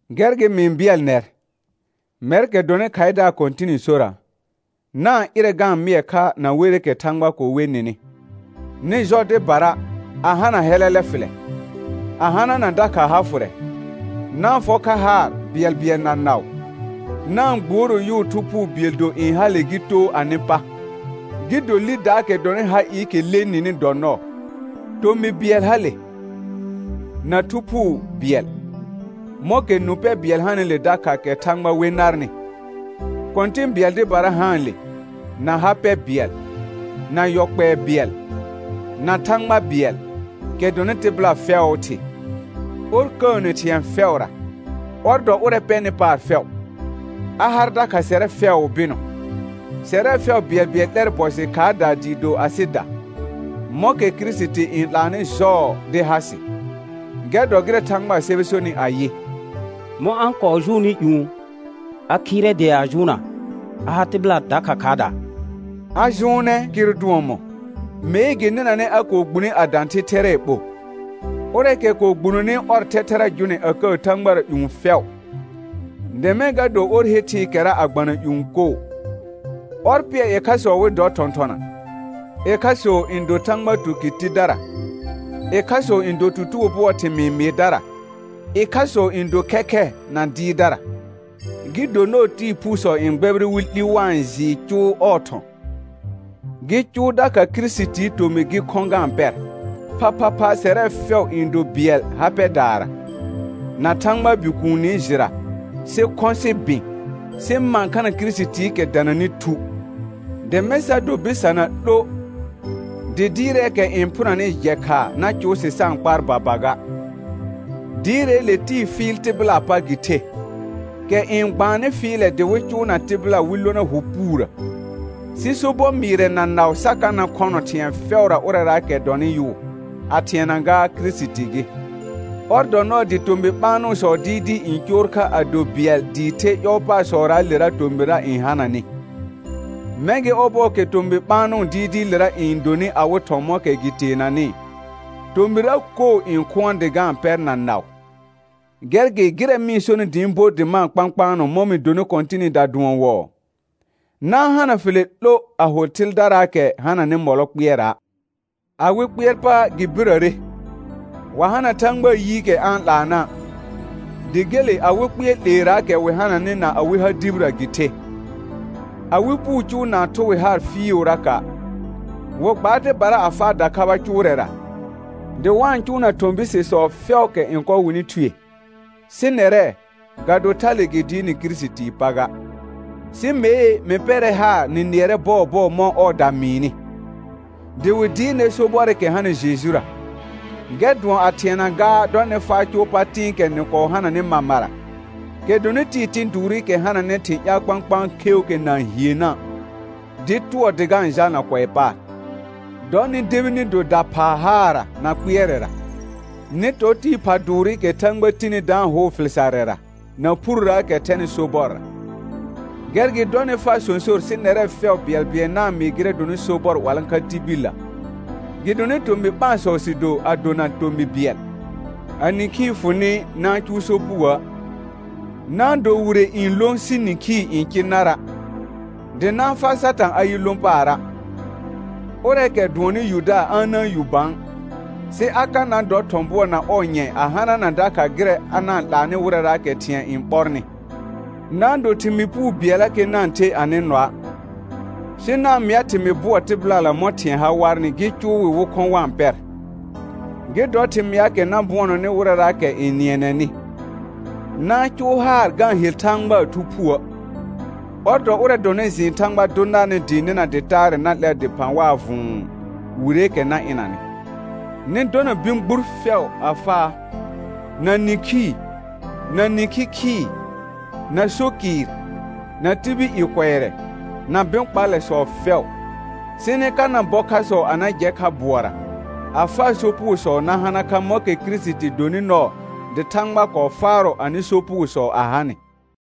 Gɛr gɩ mɩ-n bɩɛl nɛr, mɛrkɛ dɔnɩ khaɩdaar Kɔ̃tɩnɩ sora, na-n ɩrɛ ga-n mɩɛ kha na werɩkɛ Thãgba kɔɔ we nɩnɩ. Nɩ jɔ dɩbara, a hana hɛlɛlɛ fɩlɛ, a hanana dakha ha fʋrɛ. Na-n fɔ kha haar bɩɛlbɩɛl na naʋ. Na-n gbuoro yʋʋ Thu Phuu bɩɛl do n hale gɩ too anɩ pa, gɩ do lidaakɛ dɔnɩ ha ɩɩkɛ le nɩnɩ dɔ nɔɔ. Tomɩ bɩɛl hale, na Thu Phuu bɩɛl, mɔ̃kɛ nũ pɛ bɩɛl hanɩle dakha kɛ Thãgba we narnɩ. Kɔ̃tɩ̃ bɩɛl dɩbara haanle, na ha pɛ bɩɛl, na yɔ kpɛɛ bɩɛl, na Thãgba bɩɛl, kɛ dɔnɩ tɩbɩla fɛʋʋ Thɩ, ɔr kəəne thɩ̃ɛ fɛʋra, ɔr dɔ ʋrɛ pɛnɩ paar fɛʋ, a har dakha sɛrɛ fɛʋʋ bɩnɔ. Sɛrɛ fɛʋ bɩɛlbɩɛl 'lɛr bɔ jɩ khaardaa dɩɩ do asɩda, mɔ̃kɛ Kirisiti n 'laanɩ jɔɔ dɩ ha sɩ. Gɛr dɔ gɩrɛ Thãgbaa sɛbɛ sonɩ ayɩ: «Mɔ̃ a-n kɔɔ jʋʋnnɩ ƴũ, a khɩɩrɛ dea a jʋʋnna, a har tɩbɩla dakha khaardaa.» A jʋʋnɛɛ kɩr dʋɔn mɔ̃? Mee gɩ nɩnanɛ a kɔɔ gbune a dã thɩ thɛrɛɛ ɓo. Ʋrɛɛkɛ kɔɔ gbunoni ɔr thɛthɛra jʋnɛ a kəə thãgbara ƴũ fɛʋ, dɩ mɛ̃ ga do ɔr he thɩɩkɛra a gbana ƴũ koo. Ɔr pɩɛr ɩkhasɔ wɩ dɔ thɔ̃thɔna, ɩkhasɔ n do Thãgba tukɩr tidara, ɩkhasɔ n do tutugo bʋɔɔ thɩmɩɩ mɩɩdara, ɩkhasɔ n do khɛkhɛ na dɩɩrdara, gɩ do nɔɔ tɩɩ phuusɔ n gbɛbɩrɩ wɩ 'li wa-n jɩɩ cʋʋ ɔɔ thɔ̃, gɩ cʋʋ dakha Kirisitii tomɩ gɩ khɔ̃ ga-n pɛr, phaphapha sɛrɛ fɛʋ n do bɩɛl ha pɛdaara, na Thãgbaa Bikuuni jɩra, sɩ khɔ̃ sɩ bɩ̃, sɩ mãkhana Kirisitiikɛ dananɩ thu; dɩ mɛ̃ sa do bɩsana 'lo, dɩ dɩɩrɛɛkɛ n phʋnanɩ jɛ khaa na cʋʋ sɩ sa-n kpaar baba ga; dɩɩrɛɛle tɩɩ fɩɩl tɩbɩlaa pa gɩ the, kɛ n gbaannɩ fɩɩlɛ dɩ wɩ cʋʋna tɩbɩla wɩ lona hʋ puurə. Sɩ sobɔ mɩɩrɛ na naʋ sa ka na khɔnɔ thɩ̃ɛ fɛʋra ʋrɛraakɛ dɔnɩ yʋʋ, a thɩɛna gaa Kirisiti gɩ. Ɔr dɔ nɔɔ dɩ tomɩ ɓaanʋsɔ dɩɩdɩɩ n coor kha a do bɩɛl dɩɩ the ƴɔɔpasɔraalera tomɩrra n hananɩ, mɛ̃ gɩ ɔbɔɔkɛ tomɩ ɓaanʋ dɩɩdɩɩlera n donɩ awɩ thɔ̃ mɔ̃kɛ gɩ teenanɩ, tomɩrra koo n khʋɔn dɩ ga-n pɛr na naʋ. Gɛr gɩ gɩrɛ mɩ-n sonɩ dɩ ɩ̃ bo dɩ ma-n kpãkpaanɔ mɔ̃ mɩ donɩ Kɔ̃tɩnɩda dʋɔn wɔɔ: Na-n hana fɩlɛ 'lo a ho thɩldaraakɛ hananɩ mɔlɔ kpɩɛra'. Awɩ kpɩɛr pa gɩ birəre, wa hana Thãgbaa yiikɛ a-n 'laana', dɩ gele awɩ kpɩɛr 'leeraakɛ wɩ hananɩ na awɩ ha dibirə gɩ the. Awɩ puu cʋʋ na-n thʋ wɩ haar fɩɩʋraka'; wɩ gbaar dɩbara a faa dakhaba cʋʋrɛra, dɩ wa-n cʋʋna thɔ̃ bisesɔ fɛʋʋkɛ n kɔ wɩnɩ thue. Sɩ nɛrɛ, ga do thale gɩ dɩɩr nɩ Kirisitii pa ga. Sɩ mee mɩ pɛrɛ haar nɩ nɩɛrɛ bɔɔbɔɔ mɔ̃ ɔɔda mɩɩnɩ, dɩ wɩ dɩɩr nɛr sobɔrɩkɛ hanɩ Jejura, gɛr dʋɔn a thɩɛna gaa dɔ nɩ faa cʋʋ pa tɩ̃ɩkɛ nɩ kɔɔ hananɩ mamara, kɛ dɔnɩ tɩɩ tɩ̃ dʋʋrɩkɛ hananɩ thɩ̃ ƴaal kpãkpãa kheuukɛ na-n hiennə', dɩɩ tʋɔ dɩ ga-n jalna kʋɛ paar. Dɔ nɩ debi nɩ do daphaa haarra na kpɩɛrɛra. Nɩ tɔ tɩɩ pha dʋʋrɩkɛ Thãgba tini da-n hʋʋ fɩl sarrɛra na phurrəəkɛ thɛnɩ sobɔrra. Gɛr gɩ dɔ nɩ faa sõsor sɩ nɛrɛ fɛʋ bɩɛlbɩɛl na-n mɩɩ gɩrɛ dɔnɩ sobɔr 'walãkha tibillə, gɩdonɩ tomɩ ɓãasɔ sɩ do a dona tomɩ bɩɛl. A nĩkhii fʋ nɩ na-n cʋʋ sopugoə'; na-n do wire n lõ sɩ nĩkhii n cɩ nara', dɩ na-n faa Satã a yɩ lõ paara'. Ʋrɛɛkɛ dʋɔnnɩ yudaar a na-n yu bã, sɩ a ka na dɔ thɔ̃ bʋɔ na ɔɔ nyɛ̃ a hanana dakha gɩrɛ a na-n 'laanɩ wɩrɛraakɛ thɩ̃ɛ n ɓɔrnɩ. Na-n do thɩmɩɩ puu bɩɛllakɛ na-n the anɩ nɔa', sɩ na-n mɩa thɩmɩɩ bʋɔ tɩbɩlala mɔ̃ thɩ̃ɛ ha warnɩ gɩ cʋʋ wɩ wɩ khɔ̃ wa-n pɛr, gɩ dɔ thɩmɩaakɛ na bʋɔnɔnɩ wɩrɛraakɛ n nɩɛnɛnɩ. Na-n cʋʋ haar ga-n hel Thãgbaa Thu Phuə'; ɔr dɔ ʋrɛ dɔnɩ jɩɩn Thãgba dʋ narnɩ dɩɩ nɩna dɩ taarɛ na 'lɛr dɩphã waa vʋ̃ʋ, wireekɛ na ɩnanɩ. Nɩ dɔna bɩ̃ gbur fɛʋ a faa, na nĩkhii, na nĩkhi khɩɩ, na so kɩɩr, na tibil i kʋɛrɛ, na bɩ̃ kpallɛsɔ fɛʋ. Sɩ nɩ ka na bɔ khasɔ a na jɛ kha bʋɔra, a faa sopugosɔ na hana kha mɔ̃kɛ Kirisiti donɩ nɔɔ dɩ Thãgba kɔɔ faarɔ anɩ sopugosɔ a ha nɩ.